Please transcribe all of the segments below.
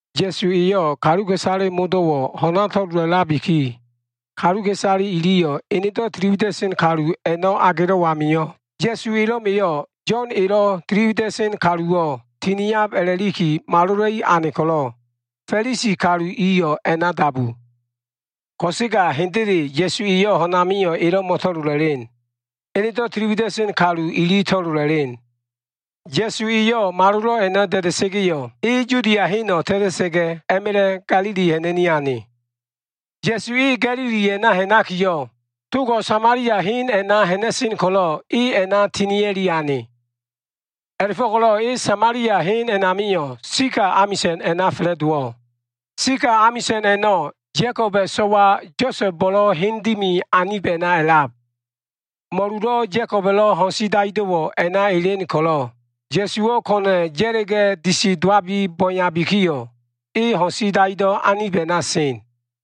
Ya꞉su eyo꞉ kaluka꞉isale modo꞉wo꞉ ho꞉na to꞉lolabiki, kaluka꞉isale iliyo꞉ enedo꞉ tili wida꞉sen kalu a꞉no꞉ agelo꞉ amio꞉, Ya꞉su elo꞉ma꞉yo꞉ Yo꞉n elo꞉ tili wida꞉sen kaluwo꞉ tiniab a꞉la꞉liki malola꞉i ane ko꞉lo꞉, Fa꞉lisi kalu iyo꞉ a꞉na dabu. Ko꞉sega hendele Ya꞉su eyo꞉ ho꞉n amio꞉ elo꞉ mo꞉to꞉lola꞉len. Enedo꞉ tili wida꞉sen kalu ili to꞉lola꞉len. Ya꞉su eyo꞉ malolo꞉ a꞉no꞉ da꞉da꞉sa꞉ga꞉yo꞉, e Yudia heno꞉ ta꞉ta꞉sa꞉ga꞉, a꞉ma꞉la꞉ Ga꞉lili ha꞉na꞉ni ane. Ya꞉su e Ga꞉lili a꞉na ha꞉nakiyo꞉, togo꞉ Samalia hen a꞉na ha꞉na꞉sen ko꞉lo꞉ e a꞉na tinia꞉li ane. A꞉la꞉fo꞉ko꞉lo꞉ e Samalia hen a꞉namio꞉ Sikal amisa꞉n a꞉na fa꞉la꞉dowo꞉. Sikal amisa꞉n a꞉no꞉ Ya꞉koba꞉ kalu so꞉wa Yosa꞉bo꞉lo꞉ hen dimi anib a꞉na a꞉lab. Mo꞉lulo꞉ Ya꞉koba꞉lo꞉ ho꞉n si daido꞉wo꞉ a꞉na elen ko꞉lo꞉, Ya꞉suwo꞉ ko꞉na꞉ ya꞉la꞉ga꞉ disi dowabi bo꞉e yabikiyo꞉, e ho꞉n si daido꞉ anib a꞉na sen.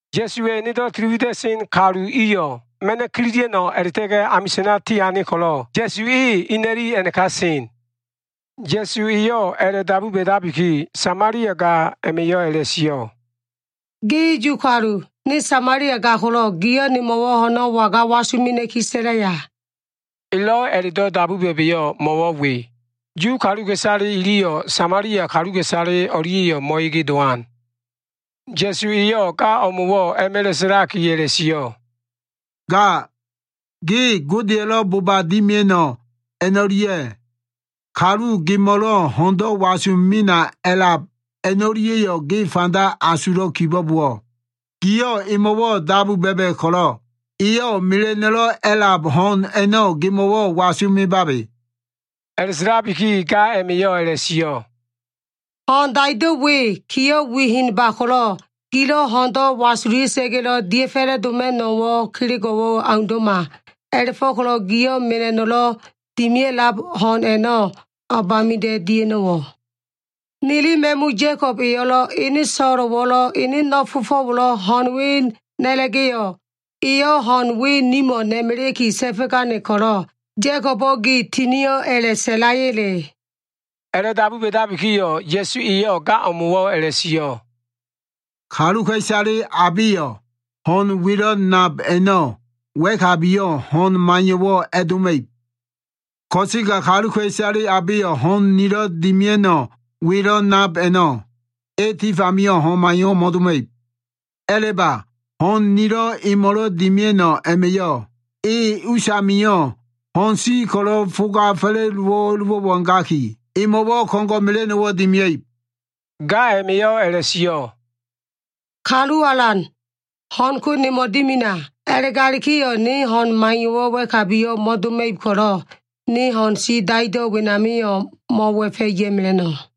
Ya꞉suwa꞉ enedo꞉ tili wida꞉sen kalu iyo꞉ ma꞉no꞉ kililia꞉no꞉ a꞉la꞉ta꞉ga꞉ amisa꞉na tiane ko꞉lo꞉, Ya꞉su e ina꞉li a꞉naka sen. Ya꞉su eyo꞉ a꞉la꞉dabu ba꞉dabiki, Samalia ga a꞉ma꞉yo꞉ a꞉la꞉sio꞉, “Ge Yu kalu. Ne Samalia ga ko꞉lo꞉ giyo꞉ nemo꞉wo꞉ ho꞉no꞉ waga wasu mena꞉ki sa꞉laya?” Elo꞉ a꞉la꞉do꞉ dabu ba꞉ba꞉yo꞉ mo꞉wo꞉ we. Yu kaluka꞉isale iliyo꞉ Samalia kaluka꞉isale o꞉lia꞉yo꞉ mo꞉ege dowan. Ya꞉su eyo꞉ ga o꞉mo꞉wo꞉ a꞉ma꞉la꞉ sa꞉laki a꞉la꞉sio꞉, “Ga ge Godeya꞉lo꞉ boba dimia꞉no꞉ a꞉no꞉lia꞉, kalu gemo꞉lo꞉ ho꞉ndo꞉ wasu mena a꞉lab a꞉no꞉lia꞉yo꞉ ge fanda asulo꞉ kibo꞉bowo꞉, giyo꞉ emo꞉ dabu ba꞉ba꞉ ko꞉lo꞉, eyo꞉ mela꞉no꞉lo꞉ a꞉lab ho꞉n a꞉no꞉ gemo꞉wo꞉ wasu mebabe.” A꞉la꞉sa꞉labiki ga a꞉ma꞉yo꞉ a꞉la꞉sio꞉ “Ho꞉n daido꞉ we kiyo꞉ wi henba ko꞉lo꞉, gilo꞉ ho꞉ndo꞉ wasulia꞉sa꞉ga꞉lo꞉ dia꞉ fa꞉la꞉ma꞉no꞉wo꞉ kelego꞉wo꞉ aundo꞉ma. A꞉la꞉fo꞉ko꞉lo꞉ gio꞉ mela꞉no꞉lo꞉ dimia꞉lab ho꞉n a꞉no꞉ o꞉bamida꞉ dia꞉no꞉wo꞉? Nili ma꞉mu Ya꞉kob eyo꞉lo꞉, ene so꞉lo꞉wo꞉lo꞉, ene no꞉ fofo꞉wo꞉lo꞉ ho꞉n we na꞉la꞉ga꞉yo꞉, eyo꞉ ho꞉n we nimo꞉ na꞉melea꞉ki ta꞉fo꞉gane ko꞉lo꞉, Ya꞉kobo꞉ gi tinio꞉ a꞉la꞉ sa꞉laya꞉le?” A꞉la꞉dabu ba꞉dabikiyo꞉, Ya꞉su eyo꞉ ga o꞉mo꞉wo꞉ a꞉la꞉sio꞉, “Kaluka꞉isale abeyo꞉ ho꞉n welo꞉ nab a꞉no꞉ wa꞉kabiyo꞉ ho꞉n maiyo꞉wo꞉ a꞉doma꞉ib. Ko꞉sega kaluka꞉isale abeyo꞉ ho꞉n nilo꞉ dimia꞉no꞉ welo꞉ nab a꞉no꞉, e tif amio꞉ ho꞉n maiyo꞉wo꞉ mo꞉doma꞉ib. A꞉la꞉ba, ho꞉n nilo꞉ emo꞉lo꞉ dimia꞉no꞉ a꞉ma꞉yo꞉ e usamio꞉ ho꞉n si ko꞉lo꞉ foga fa꞉la꞉dowa꞉lo꞉wo꞉ a꞉gaki, emo꞉wo꞉ ko꞉ngo꞉ mela꞉no꞉wo꞉ dimia꞉ib.” Ga a꞉ma꞉yo꞉ a꞉la꞉sio꞉, “Kalu Alan, ho꞉n ko nemo꞉ dimina. A꞉la꞉galikiyo꞉ ne ho꞉n maiyo꞉wo꞉ wa꞉kabiyo꞉ mo꞉doma꞉ib ko꞉lo꞉, ne ho꞉n si daido꞉ wenamio꞉ mo꞉wa꞉fa꞉ ya꞉mela꞉no꞉.”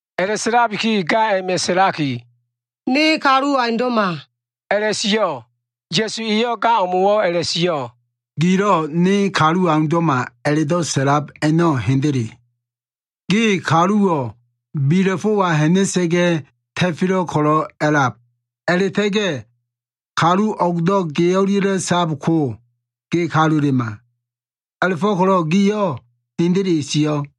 A꞉la꞉sa꞉labiki, ga a꞉ma꞉ sa꞉laki, “Ne kaluwo꞉ aundo꞉ma” a꞉la꞉sio꞉. Ya꞉su eyo꞉ ga o꞉mo꞉wo꞉ a꞉la꞉sio꞉, “Gilo꞉ ne kaluwo꞉ aundo꞉ma a꞉la꞉do꞉ sa꞉lab a꞉no꞉ hendele. Ge kaluwo꞉ bila꞉fo꞉wa ha꞉na꞉sa꞉ga꞉ ta꞉felo꞉ ko꞉lo꞉ a꞉lab. A꞉la꞉ta꞉ga꞉ kalu o꞉gdo꞉ ge o꞉lia꞉lo꞉ sab ko, ge kalulema. A꞉la꞉fo꞉ko꞉lo꞉ giyo꞉ hendele sio꞉.”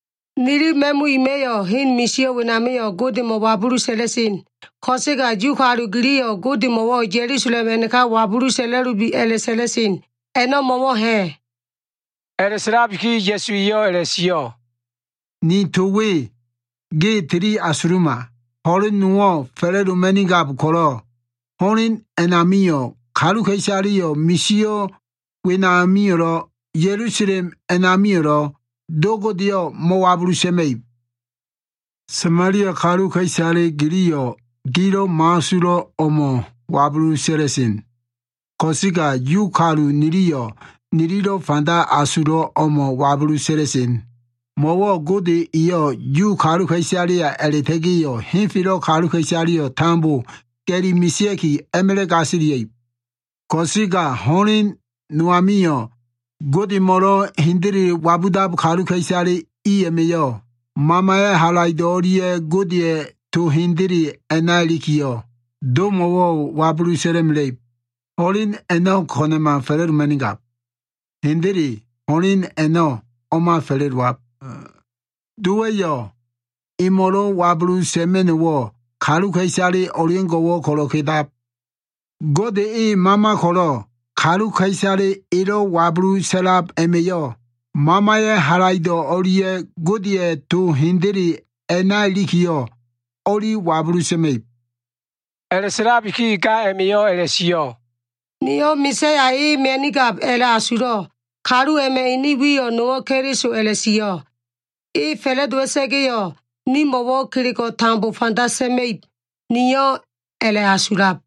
Nili ma꞉mu ima꞉yo꞉ hen misio꞉ wenamio꞉ Godemo꞉ wabulu sa꞉la꞉sen. Ko꞉sega Yu kalu giliyo꞉ Godemo꞉wo꞉ Ya꞉lusalem a꞉naka wabulu sa꞉la꞉lubi a꞉la꞉sa꞉la꞉sen. A꞉no꞉ mo꞉wo꞉ ha꞉?” A꞉la꞉sa꞉labiki Ya꞉su eyo꞉ a꞉la꞉sio꞉, “Ni to we ge tili asuluma. Ho꞉len nowo꞉ fa꞉la꞉doma꞉nigab ko꞉lo꞉, ho꞉len a꞉namio꞉ kaluka꞉isaleyo꞉ misio꞉ wenamio꞉lo꞉, Ya꞉lusalem a꞉namio꞉lo꞉ Do Godeyo꞉ mo꞉wabulu sa꞉ma꞉ib. Samalia kaluka꞉isale giliyo꞉ gilo꞉ mo꞉asulo꞉ o꞉mo꞉ wabulu sa꞉la꞉sen. Ko꞉sega Yu kalu niliyo꞉ nililo꞉ fanda asulo꞉ o꞉mo꞉ wabulu sa꞉la꞉sen. Mo꞉wo꞉ Gode eyo꞉ Yu kaluka꞉isaleya a꞉la꞉ta꞉ga꞉yo꞉ henfelo꞉ kaluka꞉isaleyo꞉ tambo ga꞉li mesea꞉ki a꞉ma꞉la꞉ gasilia꞉ib. Ko꞉sega ho꞉len no amio꞉, Godemo꞉lo꞉ hendele wabudab kaluka꞉isale i a꞉ma꞉yo꞉, Mamaya꞉ halaido꞉ o꞉lia꞉ Godeya꞉ to hendele a꞉na ilikiyo꞉, Domo꞉ wabulu sa꞉la꞉mela꞉ib. Ho꞉len a꞉no꞉ ko꞉na꞉ma fa꞉la꞉doma꞉nigab. Hendele ho꞉len a꞉no꞉ o꞉ma fa꞉la꞉dowab. Dowa꞉yo꞉ emo꞉lo꞉ wabulu sa꞉ma꞉no꞉wo꞉ kaluka꞉isale o꞉leo꞉ngo꞉wo꞉ ko꞉lo꞉ kedab. Gode e mama ko꞉lo꞉, kaluka꞉isale elo꞉ wabulu sa꞉lab a꞉ma꞉yo꞉ Mamaya꞉ halaido꞉ o꞉lia꞉ Godeya꞉ to hendele a꞉na ilikiyo꞉, o꞉li wabulu sa꞉ma꞉ib.” A꞉la꞉sa꞉labiki ga a꞉ma꞉yo꞉ a꞉la꞉sio꞉, “Niyo꞉ Ma꞉saya e mia꞉nigab a꞉la꞉asulo꞉. Kalu a꞉ma꞉ ene wiyo꞉ nowo꞉ Keliso a꞉la꞉sio꞉. E fa꞉la꞉dowa꞉sa꞉ga꞉yo꞉, nimo꞉wo꞉ kelego꞉ a꞉na tambo fanda sa꞉ma꞉ib, niyo꞉ a꞉la꞉asulab.”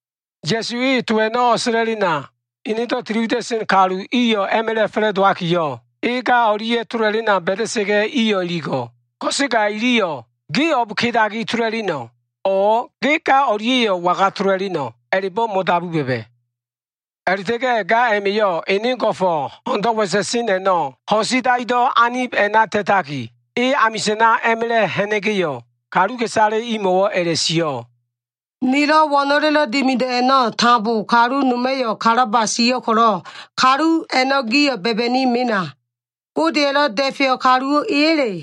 Ya꞉su e to a꞉no꞉ o꞉sa꞉la꞉lena, enedo꞉ tili wida꞉sen kalu iyo꞉ a꞉ma꞉la꞉ fa꞉la꞉dowakiyo꞉, e ga o꞉lia꞉ tola꞉lena ba꞉da꞉sa꞉ga꞉ iyo꞉ iligo꞉. Ko꞉sega iliyo꞉ “ge o꞉b kedaki tola꞉leno꞉?” o꞉ “Ge ga o꞉lia꞉yo꞉ waga tola꞉leno꞉?” a꞉la꞉bo꞉ mo꞉dabu ba꞉ba꞉. A꞉la꞉ta꞉ga꞉ ga a꞉ma꞉yo꞉ ene go꞉fo꞉ ho꞉ndo꞉ wa꞉sa꞉sen a꞉no꞉ ho꞉n si daido꞉ anib a꞉na ta꞉taki, e amisa꞉na a꞉ma꞉la꞉ ha꞉na꞉ga꞉yo꞉, kaluka꞉isale imo꞉wo꞉ a꞉la꞉sio꞉, “Nilo꞉ wo꞉no꞉lelo꞉ dimido꞉ a꞉no꞉ tambo kalu noma꞉yo꞉ kalaba sio꞉ ko꞉lo꞉, kalu a꞉no꞉ gio꞉ ba꞉ba꞉ni mena. Godeya꞉lo꞉ Da꞉feyo꞉ kaluwo꞉ eya꞉le?”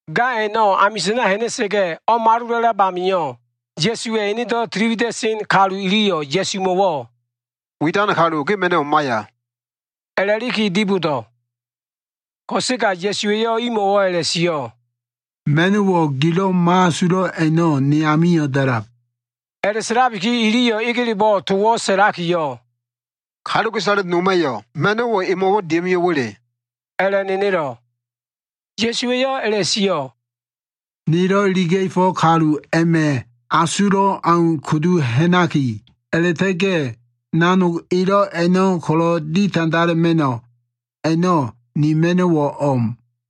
Ga a꞉no꞉ amisa꞉na ha꞉na꞉sa꞉ga꞉ o꞉malola꞉lab amio꞉, Ya꞉suwa꞉ enedo꞉ tili wida꞉sen kalu iliyo꞉ Ya꞉sumo꞉wo꞉ “Widan kalu, ge ma꞉no꞉wo꞉ maiya” a꞉la꞉liki dibodo꞉. Ko꞉sega Ya꞉su eyo꞉ imo꞉wo꞉ a꞉la꞉sio꞉, “Ma꞉no꞉wo꞉ gilo꞉ mo꞉asulo꞉ a꞉no꞉, ne amio꞉ da꞉lab.” A꞉la꞉sa꞉labiki iliyo꞉ egelebo꞉ towo꞉ sa꞉lakiyo꞉, “Kaluka꞉isale noma꞉yo꞉ ma꞉no꞉wo꞉ emo꞉wo꞉ dia꞉ mio꞉wa꞉le?” a꞉la꞉nenelo꞉. Ya꞉su eyo꞉ a꞉la꞉sio꞉, “Nelo꞉ iliga꞉fo꞉ kalu a꞉ma꞉ asulo꞉ au kudu ha꞉naki, a꞉la꞉ta꞉ga꞉ nanogo꞉ elo꞉ a꞉no꞉ ko꞉lo꞉ ditandala꞉ma꞉no꞉ a꞉no꞉ ni ma꞉no꞉wo꞉ o꞉m.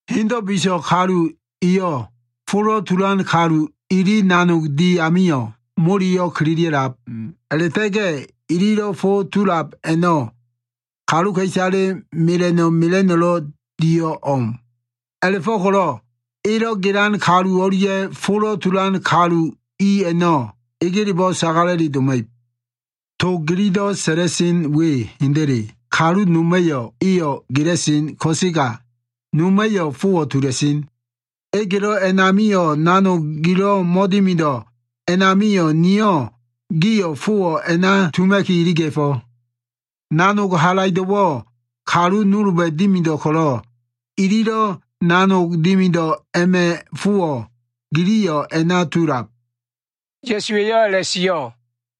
Hendo꞉ biso꞉ kalu eyo꞉ folo꞉ tulan kalu ili nanog di amio꞉ moleyo꞉ kililia꞉lab, a꞉la꞉ta꞉ga꞉ ililo꞉ fo tulab a꞉no꞉ kaluka꞉isale mela꞉no꞉ mela꞉no꞉lo꞉ dio꞉ o꞉m. A꞉la꞉fo꞉ko꞉lo꞉ elo꞉ gelan kalu o꞉lia꞉ folo꞉ tulan kalu i a꞉no꞉ egelebo꞉ sagala꞉li doma꞉ib. To gililo꞉ sa꞉la꞉sen we hendele. ‘Kalu noma꞉yo꞉ eyo꞉ gela꞉sen ko꞉sega, noma꞉yo꞉ fowo꞉ tula꞉sen.’ Egelo꞉ amilo꞉ nanogo꞉ gilo꞉ mo꞉dimido꞉ a꞉namio꞉, niyo꞉ gio꞉ fowo꞉ a꞉na tuma꞉ki iliga꞉fo꞉. Nanog halaido꞉wo꞉ kalu nolba꞉ dimido꞉ ko꞉lo꞉, ililo꞉ nanog dimido꞉ a꞉ma꞉ fowo꞉, giliyo꞉ a꞉na tulab.” Ya꞉su eyo꞉ a꞉la꞉sio꞉.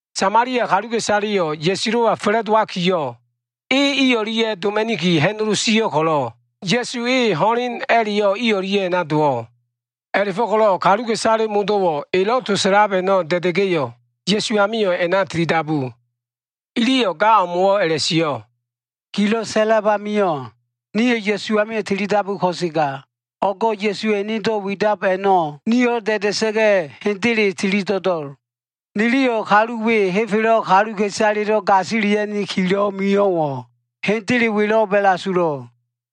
Samalia kaluka꞉isaleyo꞉ Ya꞉sulo꞉wa fa꞉la꞉dowakiyo꞉, e i o꞉lia꞉ doma꞉niki ha꞉nolo sio꞉ ko꞉lo꞉, Ya꞉su e ho꞉len a꞉la꞉yo꞉ i o꞉lia꞉ a꞉na dowo꞉. A꞉la꞉fo꞉ko꞉lo꞉ kaluka꞉isale modo꞉wo꞉ elo꞉ to sa꞉lab a꞉no꞉ da꞉da꞉ga꞉yo꞉, Ya꞉su amio꞉ a꞉na tilidabu. Iliyo꞉ ga o꞉mo꞉wo꞉ a꞉la꞉sio꞉, “Gilo꞉ sa꞉la꞉lab amio꞉, nio꞉ Ya꞉su amio꞉ tilidabu ko꞉sega, o꞉go꞉ Ya꞉suwa꞉ enedo꞉ widab a꞉no꞉ nio꞉lo꞉ da꞉da꞉sa꞉ga꞉, hendele tili do꞉do꞉l. Niliyo꞉ kalu we henfelo꞉ kaluka꞉isalelo꞉ gasilia꞉nikilo꞉ mio꞉wo꞉ hendele welo꞉b a꞉la꞉asulo꞉l.”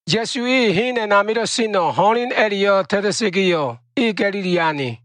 Ya꞉su e hen a꞉namilo꞉ seno꞉ ho꞉len a꞉la꞉yo꞉ ta꞉ta꞉sa꞉ga꞉yo꞉, e Ga꞉lili ane.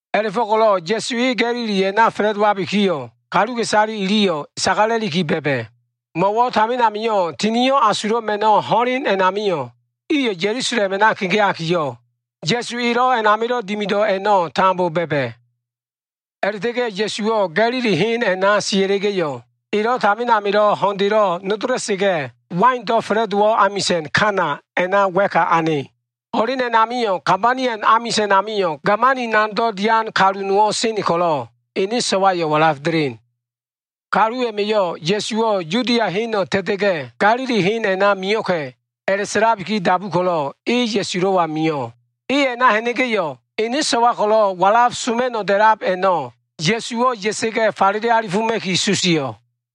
A꞉la꞉fo꞉ko꞉lo꞉ Ya꞉su e Ga꞉lili a꞉na fa꞉la꞉dowabikiyo꞉ kaluka꞉isale iliyo꞉ sagala꞉liki ba꞉ba꞉. Mo꞉wo꞉ tamin amio꞉ Tinio꞉ Asulo꞉ Ma꞉no꞉ ho꞉len a꞉namio꞉ iyo꞉ Ya꞉lusalem a꞉na kegeakiyo꞉, Ya꞉su elo꞉ a꞉namilo꞉ dimido꞉ a꞉no꞉ tambo ba꞉ba꞉. A꞉la꞉ta꞉ga꞉ Ya꞉suwo꞉ Ga꞉lili hen a꞉na sia꞉la꞉ga꞉yo꞉, elo꞉ tamin amilo꞉ ho꞉ndelo꞉ nodola꞉sa꞉ga꞉ waindo꞉ fa꞉la꞉dowo꞉ amisa꞉n Kana a꞉na wa꞉ka ane. Ho꞉len a꞉namio꞉ Kabaniom amisa꞉n amio꞉ gamani nanogdo꞉ dian kalu nowo꞉ sen ko꞉lo꞉, ene inso꞉wo꞉ walaf delen. Kalu a꞉ma꞉yo꞉ Ya꞉suwo꞉ Yudia heno꞉ ta꞉ta꞉ga꞉ Ga꞉lili hen a꞉na mio꞉ka꞉ a꞉la꞉sa꞉labiki dabu ko꞉lo꞉, e Ya꞉sulo꞉wa mio꞉. E a꞉na ha꞉na꞉ga꞉yo꞉, ene so꞉wa ko꞉lo꞉ walaf soma꞉no꞉ da꞉lab a꞉no꞉ Ya꞉suwo꞉ ya꞉sa꞉ga꞉ falele alifoma꞉ki susio꞉.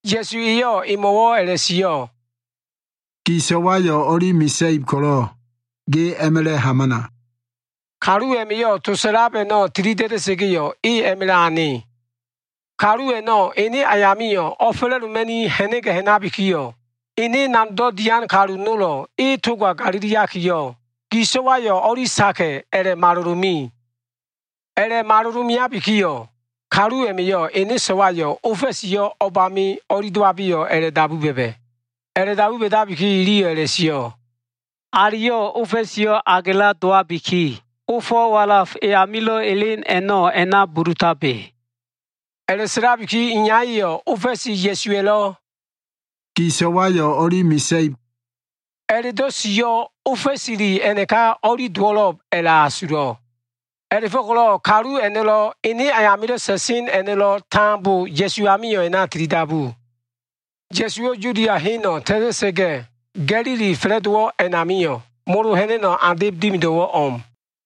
Ya꞉su eyo꞉ emo꞉wo꞉ a꞉la꞉sio꞉, “Gi so꞉wayo꞉ o꞉li mesa꞉ib ko꞉lo꞉ ge a꞉ma꞉la꞉ hamana.” Kalu a꞉ma꞉yo꞉ to sa꞉lab a꞉no꞉ tili da꞉da꞉sa꞉ga꞉yo꞉, e a꞉ma꞉la꞉ ane. Kalu a꞉no꞉ ene ayamio꞉ o꞉fa꞉la꞉doma꞉ni ha꞉na꞉ga꞉ ha꞉nabikiyo꞉, ene nanogdo꞉ dian kalu nolo꞉ e toga galiliakiyo꞉, gi so꞉wayo꞉ o꞉li saka꞉ a꞉la꞉malolo꞉ me. A꞉la꞉malolo꞉ meabikiyo꞉, kalu a꞉ma꞉yo꞉ ene so꞉wayo꞉ ofa꞉siyo꞉ o꞉bami o꞉li dowabeyo꞉ a꞉la꞉dabu ba꞉ba꞉. A꞉la꞉dabu ba꞉dabikiyo꞉ iliyo꞉ a꞉la꞉sio꞉, “Aliyo꞉ ofa꞉siyo꞉ agela dowabiki, ofo꞉ walaf e amilo꞉ elen a꞉no꞉ a꞉na bulutabe.” A꞉la꞉sa꞉labiki iyaya꞉yo꞉ ofa꞉si Ya꞉suwa꞉lo꞉ “Gi so꞉wayo꞉ o꞉li mesa꞉ib” a꞉la꞉do꞉ sio꞉, ofa꞉sile a꞉naka o꞉li dowo꞉lo꞉b a꞉la꞉asulo꞉. A꞉la꞉fo꞉ko꞉lo꞉ kalu a꞉no꞉lo꞉, ene ayamilo꞉ sa꞉sen a꞉no꞉lo꞉ tambo Ya꞉su amio꞉ a꞉na tilidabu. Ya꞉suwo꞉ Yudia heno꞉ ta꞉ta꞉sa꞉ga꞉, Ga꞉lili fa꞉la꞉dowo꞉ a꞉namio꞉, molo ha꞉na꞉no꞉ andeb dimido꞉wo꞉ o꞉m.